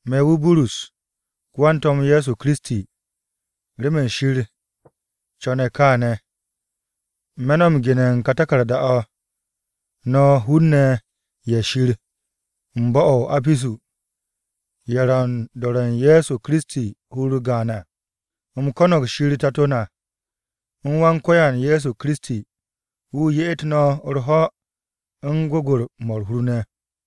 Me̱ wu̱ Burus, ko-wan-To̱m Ye̱soKiristi, remen Shir co̱ne̱ kaane̱. Me̱ no̱ m-gene̱ u̱n ka taku̱rda-o̱, no̱ hun-ne̱ ye̱ Shir u̱n bo̱-o̱ o-Apisu, ye̱ ro̱ u̱n do̱re̱ u̱n Ye̱so Kiristi hur-u̱r gaan à. U̱m ko̱no̱g Shir Tato na, u̱n Wan-Ko̱yan Ye̱so Kiristi, wu̱ ye'et no̱ u̱r-ho̱ u̱n gwu̱gwu̱-mo̱ u̱r-hur ne̱.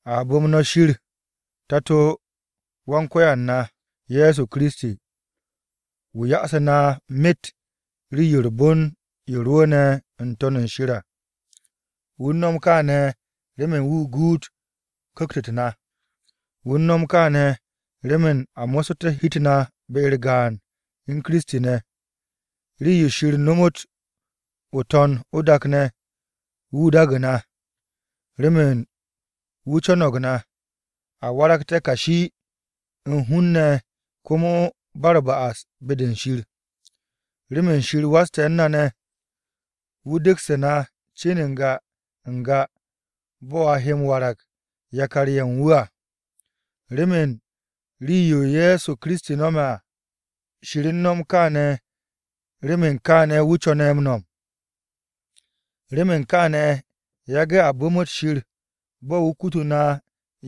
A bu̱m no̱ Shir, Tato-o Wan-Ko̱yan na, Ye̱so Kiristi. Wu̱ ya'asu̱ na myet rii-yo u̱r-bon yo rwu̱u̱ne̱ n-To̱n u̱n shir à. Wu̱ u̱n no̱m kaane̱ remen wu̱ guut ku̱kt-u̱t na. Wu̱ u̱n no̱m kaane̱ remen a mo̱ssu̱te̱ hi-u̱t na be-u̱r gaan u̱n Kiristi ne̱. Rii-yo Shir nomot o-To̱n o-dak ne̱, wu̱ daagu̱ na, remen wu̱ co̱no̱g na, a waragté̱ kashi u̱n hun-ne̱ komo ba u̱r-ba'as be-de Shir. Remen Shir waste̱ u̱n na ne̱, wu̱ degsu̱ na cin n-ga n-ga bo̱ a he m-warag yakar-ye̱ u̱n wu̱ à, remen rii-yo Ye̱so Kiristi no̱me̱ à. Shir u̱n no̱m kaane̱ remen kaane̱ wu̱ co̱ne̱ m-no̱m. Remen kaane̱, yage̱ a bu̱mu̱t Shir bo̱ wu̱ kutu na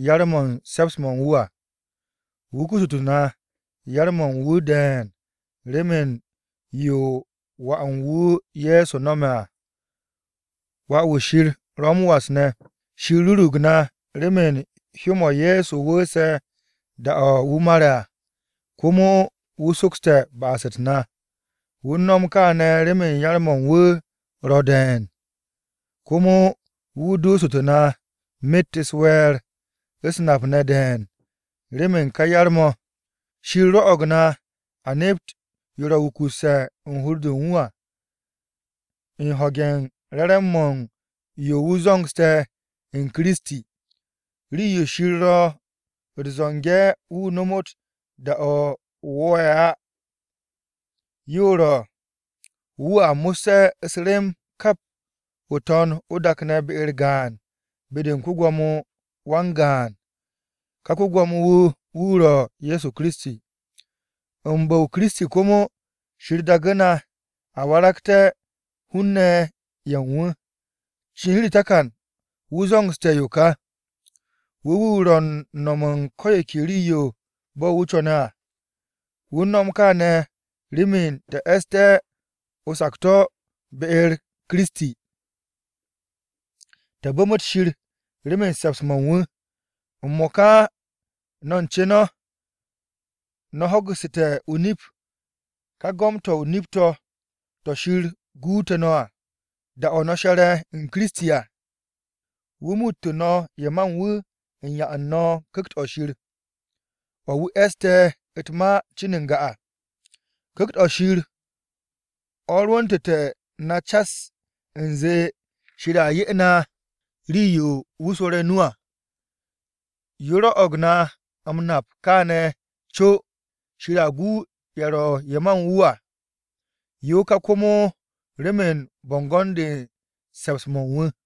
yar-mo̱ u̱n se̱ps-mo̱ u̱n wu̱ à. Wu̱ kututu̱ na yar-mo̱ u̱n wu̱ de̱e̱n remen yo Wà u̱n wu̱ Ye̱so no̱me̱ à, Wà-wu̱ Shir ro̱ m-was ne̱. Shir rurug na remen hyó-mo̱ Ye̱so wu̱u̱se̱ da-o̱ wu̱ mare̱ à, komo wu̱ sokste̱ ba'as-u̱t na. Wu̱ u̱n no̱m kaane̱ remen yar-mo̱ u̱n wu̱ ro̱ de̱e̱n. Komo wu̱ duusu̱tu̱ na myet u̱s-we̱e̱r, u̱s-nap ne̱ de̱e̱n, remen ka yar-mo̱. Shir rwo̱'o̱g na a nep yo ro̱ wukusse̱ u̱n hur-de u̱n wu̱ à, u̱n ho̱ge̱ u̱n re̱re̱m-mo̱ u̱n yo wu̱ zo̱ngse̱ u̱n Kiristi à. Rii-yo Shir ro̱ u̱t-zo̱nge̱ wu̱ nomot da-o̱ wo̱o̱'e̱ à, yo ro̱ wu̱a mo̱sse̱ u̱s-rem kap o-To̱n o-dak ne̱ be-u̱r gaan be-de u̱n ko-Gwo̱mo wan-gaan. Ka ko-Gwo̱mo-wu̱ ro̱ Ye̱so Kiristi. U̱n bu̱-o Kiristi komo, Shir daagu̱ na a waragte̱ hun-ne̱ ye̱ u̱n wu̱. Cin u̱r-takan wu̱ zo̱ngse̱ yo kà. Wu̱ wu̱ ro̱ u̱n no̱m u̱n ko̱ yo ke rii-yo bo̱ wu̱ co̱ne̱ à. Wu̱ u̱n no̱m kaane̱ remen te̱ e̱sste̱ o-sakto̱ be-u̱r Kiristi, te̱ bu̱mu̱t Shir remen se̱ps-mo̱ u̱n wu̱. M-mo̱ka no̱ u̱n ce no̱, no̱ ho̱gu̱ssu̱te̱ o-nip, ká Ma-to̱ m-Re̱re̱m to̱, to̱ Shir guute̱ no̱ à. Da-o̱ no̱ she̱re̱ u̱n Kiristi à, wu̱ muuttu̱ no̱ ye̱ ma u̱n wu̱ u̱n 'ya u̱n no̱ Ku̱kt-o̱ Shir, o̱ wu̱ e̱ste̱ u̱t-ma cin n-ga à. Ku̱kt-o̱ Shir o̱ rwu̱ntu̱te̱ na cas u̱nze Shir a 'ye na rii-yo wu̱ swo̱re̱ o-nu à, yo rwo̱'o̱g na m-nap kane̱ u̱n co Shir a gu ye̱ ro̱ ye̱ ma u̱n wu̱ à. Yo ka komo remen bo̱ngo̱n-de u̱n se̱ps-mo̱ u̱n wu̱ o̱.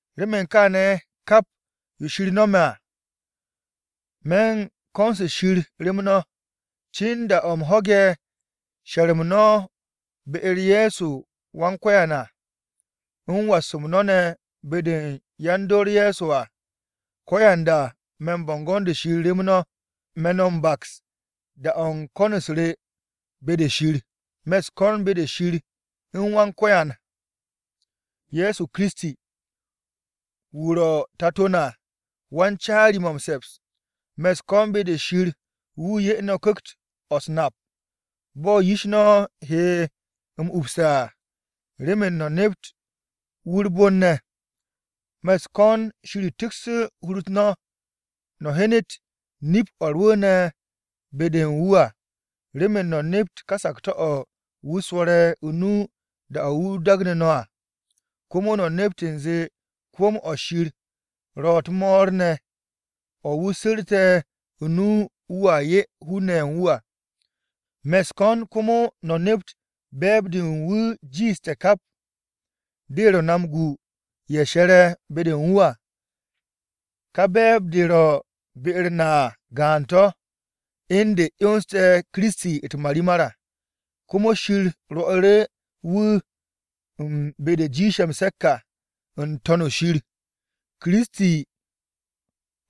Remen kaane̱ kap yo Shir no̱me̱ à, me̱ u̱n ko̱n-se Shir rem no̱. Cin da-o̱ u̱m ho̱ge̱ she̱r-m no̱ be-u̱r Ye̱so Wan-Ko̱yan à u̱n was-m no̱ ne̱ be-de u̱n yan-dor Ye̱so à, ko̱yanda me̱ u̱n bo̱ngo̱n-de Shir rem no̱. Me̱ no̱ m-baks da-o̱ u̱n ko̱n-u̱s re be-de Shir. Me̱ u̱s-ko̱n be-de Shir ye̱ u̱n Wan-Ko̱yan na, Ye̱so Kiristi. Wu̱ ro̱ Tato na wan-caari-mo̱ m-se̱ps. Me̱ u̱s-ko̱n be-de Shir wu̱ 'ye no̱ ku̱kt-o̱ u̱s-nap, bo̱ yish no̱ he m-upse̱ à, remen no̱ nept wu̱ u̱r-bon ne̱. Me̱ u̱s-ko̱n Shir tiksh hur-u̱t no̱, no̱ hyenet nip-o̱ rwu̱u̱ne̱ be-de u̱n wu̱ à remen no̱ nept ka sakto̱-o̱ wu̱ swo̱re̱ o-nu da-o̱ wu̱ dagnu̱ no̱ à. Komo no̱ nept u̱nze se̱ps-mo̱ Shir ro̱ u̱t-mo̱o̱r ne̱ o̱ wu̱ su̱rte̱ o-nu wu̱a 'ye hun-ne̱ ye̱ u̱n wu̱ à. Me̱ u̱s-ko̱n komo no̱ nept be̱e̱b-de u̱n wu̱ jiishte̱ kap, de ro̱ na m-gu ye̱ she̱re̱ be-de u̱n wu̱ à. Ka be̱e̱b-de ro̱ be-u̱r na à gaan-to̱, u̱n de 'yonse̱ Kiristi ne̱ u̱t-marimar à. Komo Shir rwo̱'u̱ru̱ wu̱ u̱n be-de jiishe̱ m-se̱k à n-To̱n shir. Kiristi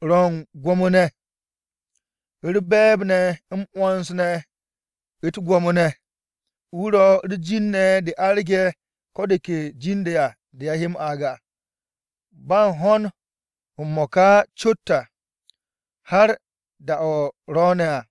ro̱ u̱n gwo̱mo-to̱ u̱n gwo̱mo-ne̱, u̱r-be̱e̱b ne̱ m-'wo̱ns ne̱ u̱t-gwo̱mo ne̱. Wu̱ ro̱ u̱r-jin ne̱ de arge̱ ko̱ de ke jin-de à de a he m-aag à, ba u̱n ho̱n m-mo̱ka cot à, har da-o̱ ro̱o̱ne̱ à.